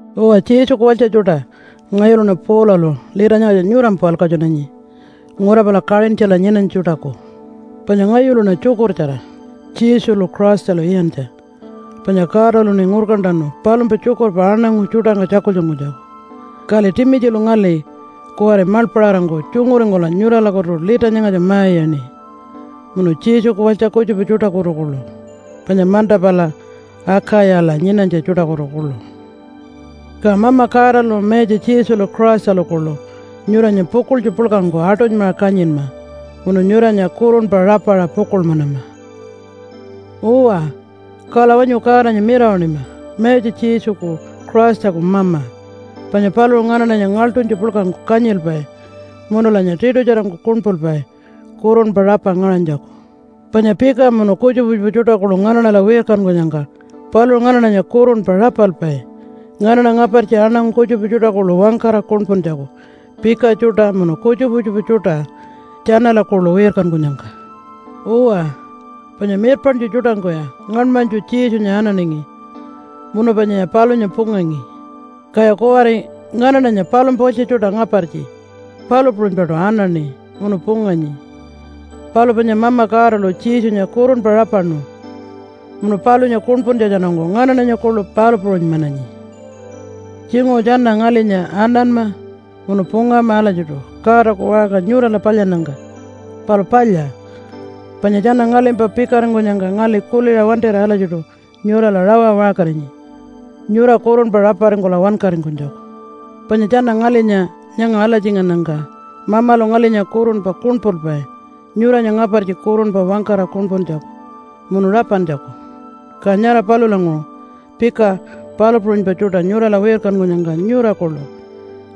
Uwa, Jesuku walytja tjuṯa! Ngayuluṉa Paulalu lita nyangatja nyurampa walkatjunanyi ngura pala Kaṟintjala nyinanytja tjuṯaku. Panya ngayuluṉa tjukurtjara Jesulu Christalu iyantja, panya Godaluṉi ngurkantanu palumpa tjukurpa aṉangu tjuṯangka tjakultjunkunytjaku. Kali Timitjilu ngali kuwari maḻpaṟarangku tjunguringkula nyuralakutu lita nyangatja ma-iyaṉi, munu Jesuku walytja kutjupa tjuṯakutu kuḻu, panya manta pala Akayala nyinanytja tjuṯakutu kuḻu. Ka Mama Godalu, Mayatja Jesulu Christalu kuḻu nyuranya pukuḻtju puḻkangku aṯunymaṟa kanyinma munu nyuranya kurunpa rapaṟa pukuḻmanama. Uwa, kala wanyu Godanya mirawaṉima Mayatja Jesuku Christaku Mama, panya paluṟu nganaṉanya ngaḻṯunytju puḻkangku kanyilpai munulanya tiṯutjarangku kuṉpulpai kurunpa rapa ngaṟanytjaku. Panya pika munu kutjupa kutjupa tjuṯa kuḻu nganaṉala wirkankunyangka paluṟu nganaṉanya kurunpa rapalpai nganaṉa ngapartji aṉangu kutjupa tjuṯa kuḻu wangkara kuṉpuntjaku pika tjuṯa munu kutjupa kutjupa tjuṯa tjanala kuḻu wirkankunyangka. Uwa, panya mirpaṉtju tjuṯangkuya ngaṉmanytju Jesunya ananingi munu panyaya palunya pungangi, kaya kuwari nganaṉanya palumpa walytja tjuṯa ngapartji palu puṟunypaṯu anaṉi munu punganyi. Palu panya Mama Godalu Jesunya kurunpa rapaṉu munu palunya kuṉpuntjatjanungku nganaṉanya kuḻu palu puṟunymananyi. Tjinguṟu tjana ngalinya ananma munu pungama alatjiṯu Godaku waṟka nyurala palyannyangka. Palu palya, panya tjana ngalimpa pikaringkunyangka ngali kuliṟa wantira alatjiṯu nyurala rawa waṟkarinyi nyura kurunpa raparingkula wankaringkunytjaku. Panya tjana ngalinya nyanga alatjingannyangka Mamalu ngalinya kurunpa kuṉpulpai nyuranya ngapartji kurunpa wangkara kuṉpuntjaku munu rapantjaku. Ka nyara palulanguṟu pika palu puṟunypa tjuṯa nyurala wirkankunyangka nyura kuḻu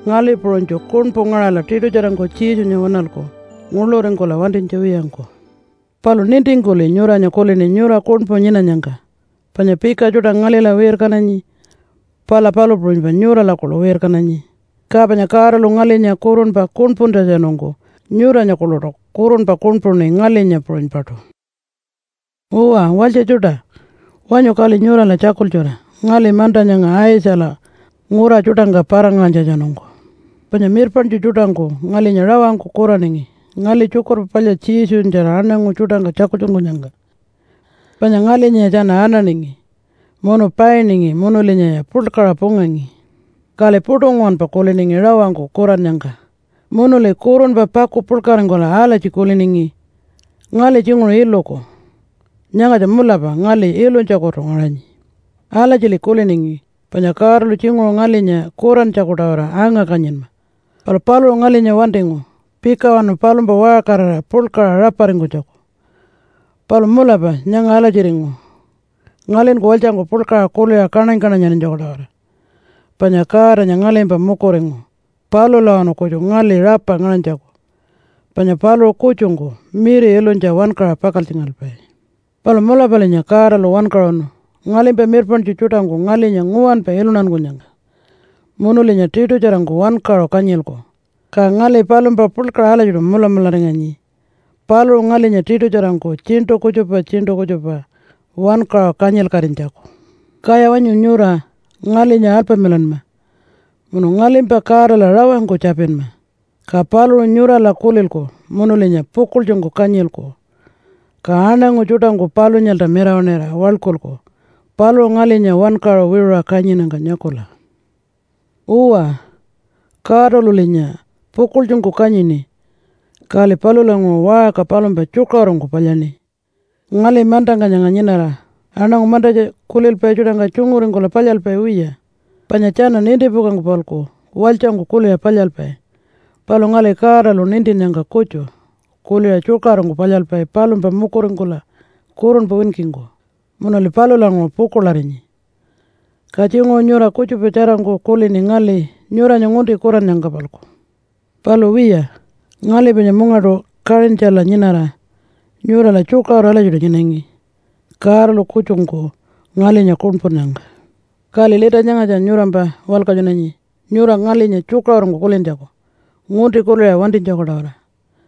ngali puṟunytju kuṉpu ngaṟala tiṯutjarangku Jesunya waṉalku nguḻuringkula wantinytja wiyangku. Palu nintingkuli nyuranya kulini nyura kuṉpu nyinanyangka. Panya pika tjuṯa ngalila wirkananyi, pala palu puṟunypa nyurala kuḻu wirkananyi. Ka panya Godalu ngalinya kurunpa kuṉpuntjatjanungku nyuranya kuḻuṯu kurunpa kuṉpuṉi ngalinya puṟunypaṯu. Uwa, walytja tjuṯa! Wanyu kali nyurala tjakultjura ngali manta nyanga Aitjala ngura tjuṯangka para-ngaṟanytjatjanungku. Panya mirpaṉtju tjuṯangku ngalinya rawangku kuraningi ngali Tjukurpa Palya Jesunyatjara aṉangu tjuṯangka tjakultjunkunyangka. Panya ngalinyaya tjana ananingi munu painingi munulinyaya puḻkaṟa pungangi. Kali puṯu nguwanpa kuliningi rawangku kurannyangka, munuli kurunpa paku puḻkaringkula alatji kuliningi, “Ngali tjinguṟu iluku. Nyangatja mulapa ngali ilunytjakutu ngaṟanyi.” Alatjili kuliningi panya Godalu tjinguṟu ngalinya kurantjaku-tawara anga-kanyinma, palu paluṟu ngalinya wantingu pikawanu palumpa waṟkarira puḻkaṟa raparingkunytjaku. Palu mulapa nyanga alatjiringu ngalinku walytjangku puḻkaṟa kuliṟa kaṉany-kaṉanyarinytjaku-tawara, panya Godanya ngalimpa mukuringu palulawanu kutju ngali rapa ngaṟanytjaku, panya paluṟu kutjungku miri ilunytja wankaṟa pakaltjingalpai. Palu mulapalinya Godalu wankaṟunu ngalimpa mirpaṉtju tjuṯangku ngalinya nguwanpa iluntankunyangka. Munulinya tiṯutjarangku wankaṟu kanyilku. Ka ngali palumpa puḻkaṟa alatjiṯu mulamularinganyi paluṟu ngalinya tiṯutjarangku tjiṉṯu kutjupa tjiṉṯu kutjupa wankaṟu kanyilkatinytjaku. Kaya wanyu nyura ngalinya alpamilanma munu ngalimpa Godala rawangku tjapinma. Ka paluṟu nyurala kulilku munulinya pukuḻtjungku kanyilku. Ka aṉangu tjuṯangku palunyalta mirawaṉira waḻkulku paluṟu ngalinya wankaṟu wiṟuṟa kanyinnyangka nyakula. Uwa, Godalulinya pukuḻtjungku kanyini kali palulanguṟu waṟka palumpa tjukaṟurungku palyaṉi. Ngali mantangka nyanga nyinara aṉangu mantatja kulilpai tjuṯangka tjunguringkula palyalpai wiya, panya tjana nintipukangku-palku walytjangku kuliṟa palyalpai. Palu ngali Godalu nintinnyangka kutju kuliṟa tjukaṟurungku palyalpai palumpa mukuringkula kurunpa winkingku, munuli palulanguṟu pukuḻarinyi. Ka tjinguṟu nyura kutjupa tjarangku kulini ngali nyuranya ngunti kurannyangka-palku. Palu wiya, ngali panya mungaṯu Kaṟintjala nyinara nyurala tjukaṟuru alatjiṯu nyinangi Godalu kutjungku ngalinya kuṉpunnyangka. Kali lita nyangatja nyurampa walkatjunanyi nyura ngalinya tjukaṟurungku kulintjaku ngunti kuliṟa wantinytjaku-tawara.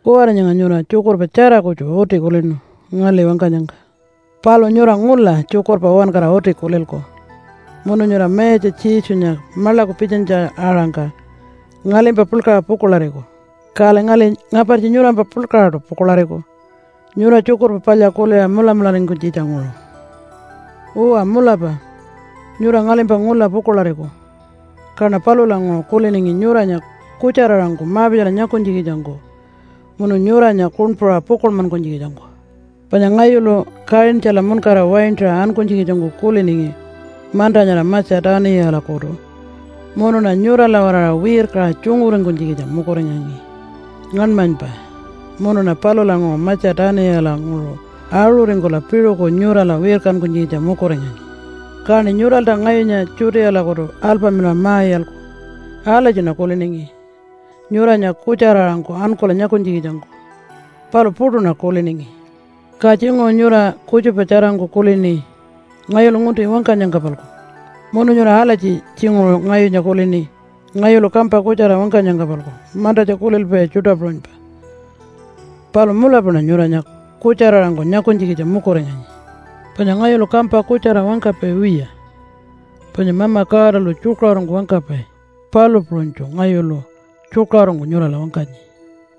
Kuwari nyanga nyura tjukurpa tjara kutju uti kulinu ngali wangkanyangka. Palu nyura ngula tjukurpa uwankara uti kulilku munu nyura Mayatja Jesunya maḻaku pitjanytja-aṟangka ngalimpa puḻkaṟa pukuḻariku, kali ngali ngapartji nyurampa puḻkaṟaṯu pukuḻariku nyura Tjukurpa Palya kuliṟa mulamularingkunytjitja-nguṟu. Uwa, mulapa nyura ngalimpa ngula pukuḻariku. Kaṉa palulanguṟu kuliningi nyuranya kutjara-aṟangku ma-pitjala nyakunytjikitjangku munu nyuranya kuṉpuṟa pukuḻmankunytjikitjangku. Panya ngayulu Kaṟintjala muṉkara waintaṟa ankunytjikitjangku kuliningi manta nyara Matja-tuniyalakutu munuṉa nyurala-waraṟa wirkaṟa tjunguringkunytjikitja mukuringangi ngaṉmanypa munuṉa palulanguṟu Matja-tuniyalanguṟu aṟuringkula piṟuku nyurala wirkankunytjikitja mukuringanyi. Kaṉi nyuralta ngayunya Judealakutu alpamilaṟa ma-iyalku. Alatjiṉa kuliningi nyuranya kutjara-aṟangku ankula nyakunytjikitjangku, palu puṯuṉa kuliningi. Ka tjinguṟu nyura kutjupa tjarangku kulini ngayulu ngunti wangkanyangka-palku munu nyura alatji tjinguṟu ngayunya kulini ngayulu kampa kutjara wangkanyangka-palku mantatja kulilpai tjuṯa puṟunypa. Palu mulapaṉa nyuranya kutjara-aṟangku nyakunytjikitja mukuringangi. Panya ngayulu kampa kutjara wangkapai wiya, panya Mama Godalu tjukaṟurungku wangkapai, palu puṟunytju ngayulu tjukaṟurungku nyurala wangkanyi.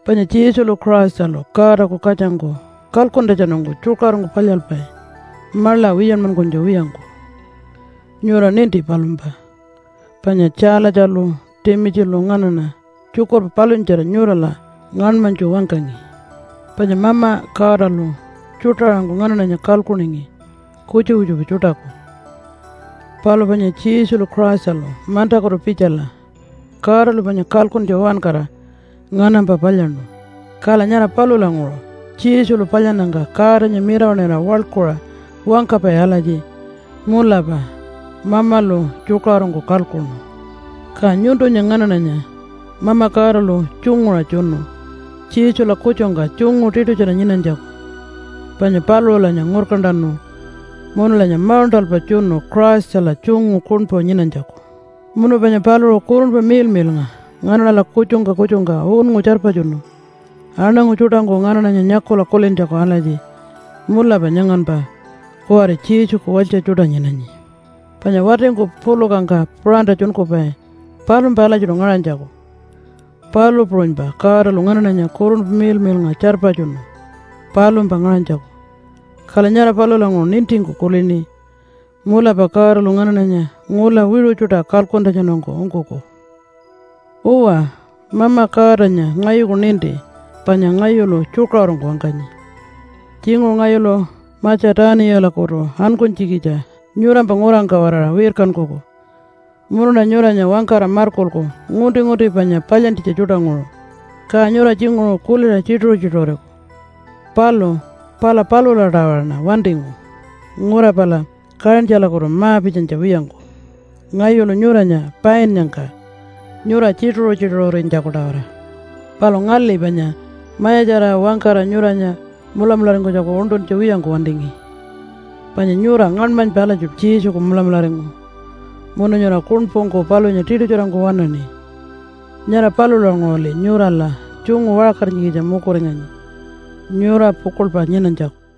Panya Jesulu Christalu Godaku katjangku kalkuntjatjanungku tjukaṟurungku palyalpai maḻa wiyanmankunytja wiyangku. Nyura ninti palumpa, panya Tjaalatjalu Timitjilu nganaṉa tjukurpa palunyatjara nyurala ngaṉmanytju wangkangi. Panya Mama Godalu tjuṯa-aṟangku nganaṉanya kalkuningi kutjupa kutjupa tjuṯaku. Palu panya Jesulu Christalu mantakutu pitjala Godalu panya kalkuntja uwankara nganampa palyaṉu. Kala nyara palulanguṟu Jesulu palyannyangka Godanya mirawaṉira waḻkuṟa wangkapai alatji, “Mulapa Mamalu tjukaṟurungku kalkuṉu.” Ka nyuntunya nganaṉanya Mama Godalu tjunguṟa tjunu Jesula kutjungka tjungu tiṯutjara nyinanytjaku. Panya paluṟulanya ngurkantanu munulanya mauṉṯalpa tjunu Christala tjungu kuṉpu nyinanytjaku. Munu panya paluṟu Kurunpa Miḻmiḻnga nganaṉala kutjungka kutjungka unngu tjarpatjunu aṉangu tjuṯangku nganaṉanya nyakula kulintjaku, alatji, “Mulapa nyanganpa kuwari Jesuku walytja tjuṯa nyinanyi.” Panya watingku pulukangka puṟantatjunkupai palumpa alatjiṯu ngaṟanytjaku, palu puṟunypa Godalu nganaṉala Kurunpa Miḻmiḻnga tjarpatjunu palumpa ngaṟanytjaku. Kala nyara palulanguṟu nintingku kulini, “Mulapa Godalu nganaṉanya ngula wiṟu tjuṯa kalkuntjatjanungku ungkuku.” Uwa, Mama Godanya ngayuku ninti panya ngayulu tjukaṟurungku wangkanyi. Tjinguṟu ngayulu Matja-tuniyalakutu ankunytjikitja nyurampa ngurangka-waraṟa wirkankuku munuṉa nyuranya wangkara markulku ngunti-ngunti panya palyantjitja tjuṯanguṟu, ka nyura tjinguṟu kuliṟa tjituṟu-tjituṟuriku. Palu pala palula-tawaraṉa wantingu ngura pala Kaṟintjalakutu ma-pitjanytja wiyangku ngayulu nyuranya painnyangka nyura tjituṟu-tjituṟurinytjaku-tawara. Palu ngali panya mayatjarira wangkara nyuranya mulamularingkunytjaku uṉṯuntja wiyangku wantingi. Panya nyura ngaṉmanypa alatjiṯu Jesuku mulamularingu munu nyura kuṉpungku palunya tiṯutjarangku waṉaṉi. Nyara palulanguṟuli nyurala tjungu waṟkarinytjikitja mukuringanyi nyura pukuḻpa nyinanytjaku.